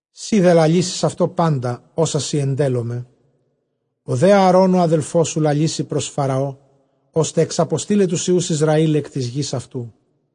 Σὺ δὲ λαλήσεις αὐτῷ πάντα ὅσα σοι ἐντέλλομαι· ὁ δὲ Ἀαρὼν ὁ ἀδελφός σου λαλήσει πρὸς Φαραὼ, ὥστε ἐξαποστεῖλαι τοὺς υἱοὺς Ἰσραὴλ ἐκ τῆς γῆς αὐτοῦ.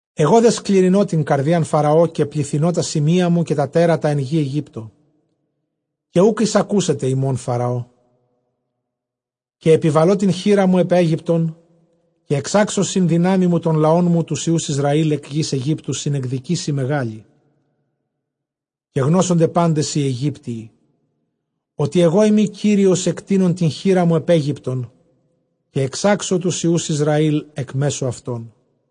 Ἐγὼ δὲ σκληρυνῶ τὴν καρδίαν Φαραὼ, καὶ πληθυνῶ τὰ σημεῖά μου καὶ τὰ τέρατα ἐν γῇ Αἰγύπτῳ. Καὶ οὐκ εἰσακούσεται ὑμῶν Φαραώ· καὶ ἐπιβαλῶ τὴν χεῖρά μου ἐπʼ Αἴγυπτον, καὶ ἐξάξω σὺν δυνάμει μου τὸν λαόν μου τοὺς υἱοὺς Ἰσραὴλ ἐκ γῆς Αἰγύπτου σὺν ἐκδικήσει μεγάλῃ. Καὶ γνώσονται πάντες οἱ Αἰγύπτιοι ὅτι ἐγώ εἰμι Κύριος, ἐκτείνων τὴν χεῖρά μου ἐπʼ Αἴγυπτον, καὶ ἐξάξω τοὺς υἱοὺς Ἰσραὴλ ἐκ μέσον αὐτῶν.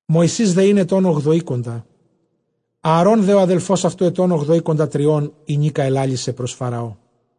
Μωυσῆς δὲ ἦν ἐτῶν ὀγδοήκοντα, Ἀαρὼν δὲ ὁ ἀδελφὸς αὐτοῦ ἐτῶν ὀγδοήκοντατριῶν, ἡνίκα ἐλάλησεν πρὸς Φαραώ.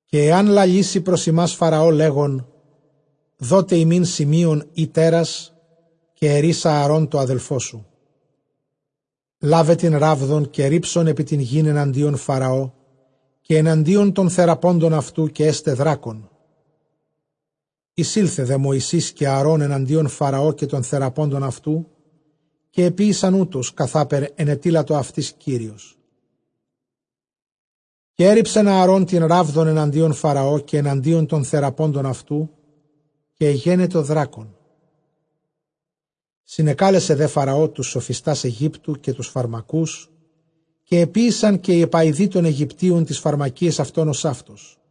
καὶ ἐὰν λαλήσῃ πρὸς ὑμᾶς Φαραὼ, λέγων, δότε ἡμῖν σημεῖον ἢ τέρας, καὶ ἐρεῖς Ἀαρὼν τῷ ἀδελφῷ σου, λάβε τὴν ῥάβδον, καὶ ῥίψον ἐπὶ τὴν γῆν ἐναντίον Φαραὼ, καὶ ἐναντίον τῶν θεραπόντων αὐτοῦ, καὶ ἔσται δράκων. Εἰσῆλθε δὲ Μωυσῆς καὶ Ἀαρὼν ἐναντίον Φαραὼ, καὶ τῶν θεραπόντων αὐτοῦ· καὶ ἐποίησαν οὕτως, καθάπερ ἐνετείλατο αὐτοῖς Κύριος· καὶ ἔῤῥιψεν Ἀαρὼν τὴν ῥάβδον ἐναντίον Φαραὼ, καὶ ἐναντίον τῶν θεραποντων αὐτοῦ, καὶ ἐγένετο δράκων. Συνεκάλεσε δὲ Φαραὼ τοὺς σοφιστὰς Αἰγύπτου, καὶ τοὺς φαρμακούς· καὶ ἐποίησαν καὶ οἱ ἐπαοιδοὶ τῶν Αἰγυπτίων ταῖς φαρμακίαις αὐτῶν ὡσαύτως.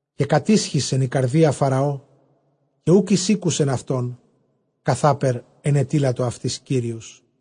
Καὶ κατίσχυσεν ἡ καρδία Φαραὼ, καὶ οὐκ εἰσήκουσεν αὐτῶν, καθάπερ ἐνετείλατο αὐτοῖς Κύριος.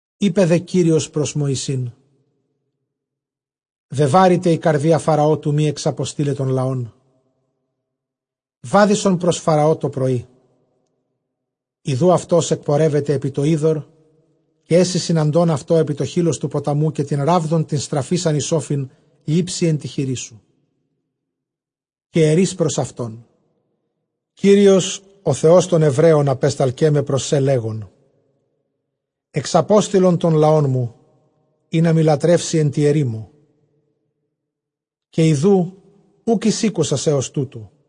Εἶπε δὲ Κύριος πρὸς Μωυσῆν, βεβάρηται ἡ καρδία Φαραὼ, τοῦ μὴ ἐξαποστεῖλαι τὸν λαόν. Βάδισον πρὸς Φαραὼ τὸ πρωΐ· ἰδοὺ αὐτὸς ἐκπορεύεται ἐπὶ τὸ ὕδωρ, καὶ ἔσῃ συναντῶν αὐτῷ ἐπὶ τὸ χεῖλος τοῦ ποταμοῦ· καὶ τὴν ῥάβδον τὴν στραφεῖσαν εἰς ὄφιν λήψῃ ἐν τῇ χειρί σου. Καὶ ἐρεῖς πρὸς αὐτὸν, Κύριος ὁ Θεὸς τῶν Ἐβραίων ἀπέσταλκέ με πρὸς σὲ, λέγων, ἐξαπόστειλον τὸν λαόν μου, ἵνα μοι λατρεύσῃ ἐν τῇ ἐρήμῳ· καὶ ἰδοὺ οὐκ εἰσήκουσας ἕως τούτου.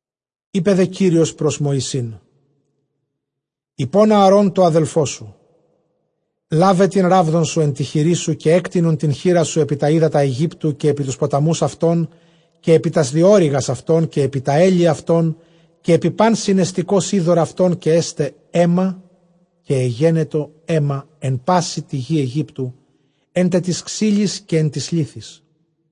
Εἶπε δὲ Κύριος πρὸς Μωυσῆν, εἶπὸν Ἀαρὼν τῷ ἀδελφῷ σου, λάβε τὴν ῥάβδον σου ἐν τῇ χειρί σου, καὶ ἔκτεινον τὴν χεῖρά σου ἐπὶ τὰ ὕδατα Αἰγύπτου, καὶ ἐπὶ τοὺς ποταμοὺς αὐτῶν, καὶ ἐπὶ τὰς διώρυγας αὐτῶν, καὶ ἐπὶ τὰ ἕλη αὐτῶν, καὶ ἐπὶ πᾶν συνεστηκὸς ὕδωρ αὐτῶν, καὶ ἔσται αἷμα· καὶ ἐγένετο αἷμα ἐν πάσῃ γῇ Αἰγύπτου, ἔν τε τοῖς ξύλοις καὶ ἐν τοῖς λίθοις.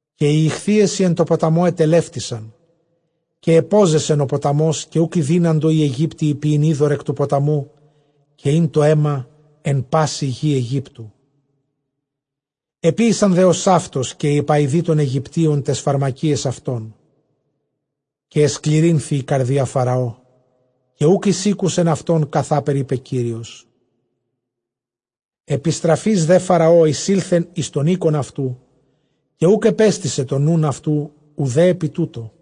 Καὶ οἱ ἰχθύες οἱ ἐν τῷ ποταμῷ ἐτελεύτησαν· καὶ ἐπώζεσεν ὁ ποταμὸς, καὶ οὐκ ἠδύναντο οἱ Αἰγύπτιοι πιεῖν ὕδωρ ἐκ τοῦ ποταμοῦ· καὶ ἦν τὸ αἷμα ἐν πάσῃ γῇ Αἰγύπτου. Ἐποίησαν δὲ ὡσαύτως καὶ οἱ ἐπαοιδοὶ τῶν Αἰγυπτίων ταῖς φαρμακίαις αὐτῶν· καὶ ἐσκληρύνθη ἡ καρδία Φαραὼ, καὶ οὐκ εἰσήκουσεν αὐτῶν, καθάπερ εἶπε Κύριος. Ἐπιστραφεὶς δὲ Φαραὼ εἰσῆλθεν εἰς τὸν οἶκον αὐτοῦ· καὶ οὐκ ἐπέστησε τὸν νοῦν αὐτοῦ οὐδὲ ἐπὶ τούτῳ.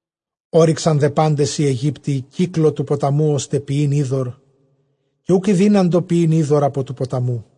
Ὤρυξαν δὲ πάντες οἱ Αἰγύπτιοι κύκλῳ τοῦ ποταμοῦ, ὥστε πιεῖν ὕδωρ· καὶ οὐκ ἠδύναντο πιεῖν ὕδωρ ἀπὸ τοῦ ποταμοῦ.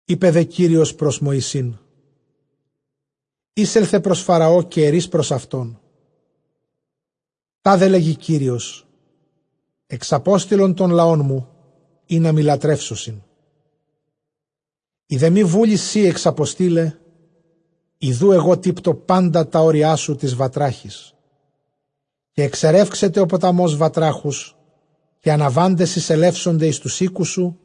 Εἶπε δὲ Κύριος πρὸς Μωυσὴν, εἴσελθε πρὸς Φαραὼ, καὶ ἐρεῖς πρὸς αὐτὸν, τάδε λεγέι Κύριος, ἐξαπόστειλον τὸν λαόν μου, ἵνα μοι λατρεύσωσιν. Εἰ δὲ μὴ βούλει σὺ ἐξαποστεῖλαι, ἰδοὺ ἐγὼ τύπτω πάντα τὰ ὅριά σου τοῖς βατράχοις. Καὶ ἐξερεύξεται ὁ ποταμὸς βατράχους· καὶ ἀναβάντες εἰσελεύσονται εἰς τοὺς οἴκους σου,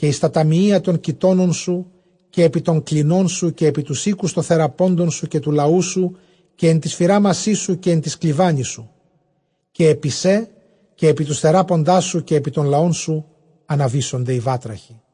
καὶ εἰς τὰ ταμιεῖα τῶν κοιτώνων σου, καὶ ἐπὶ τῶν κλινῶν σου, καὶ ἐπὶ τοὺς οἴκους τῶν θεραπόντων σου, καὶ τοῦ λαοῦ σου, καὶ ἐν τοῖς φυράμασί σου, καὶ ἐν τοῖς κλιβάνοις σου. Καὶ ἐπὶ σὲ, καὶ ἐπὶ τοὺς θεράποντάς σου, καὶ ἐπὶ τὸν λαόν σου, ἀναβήσονται οἱ βάτραχοι.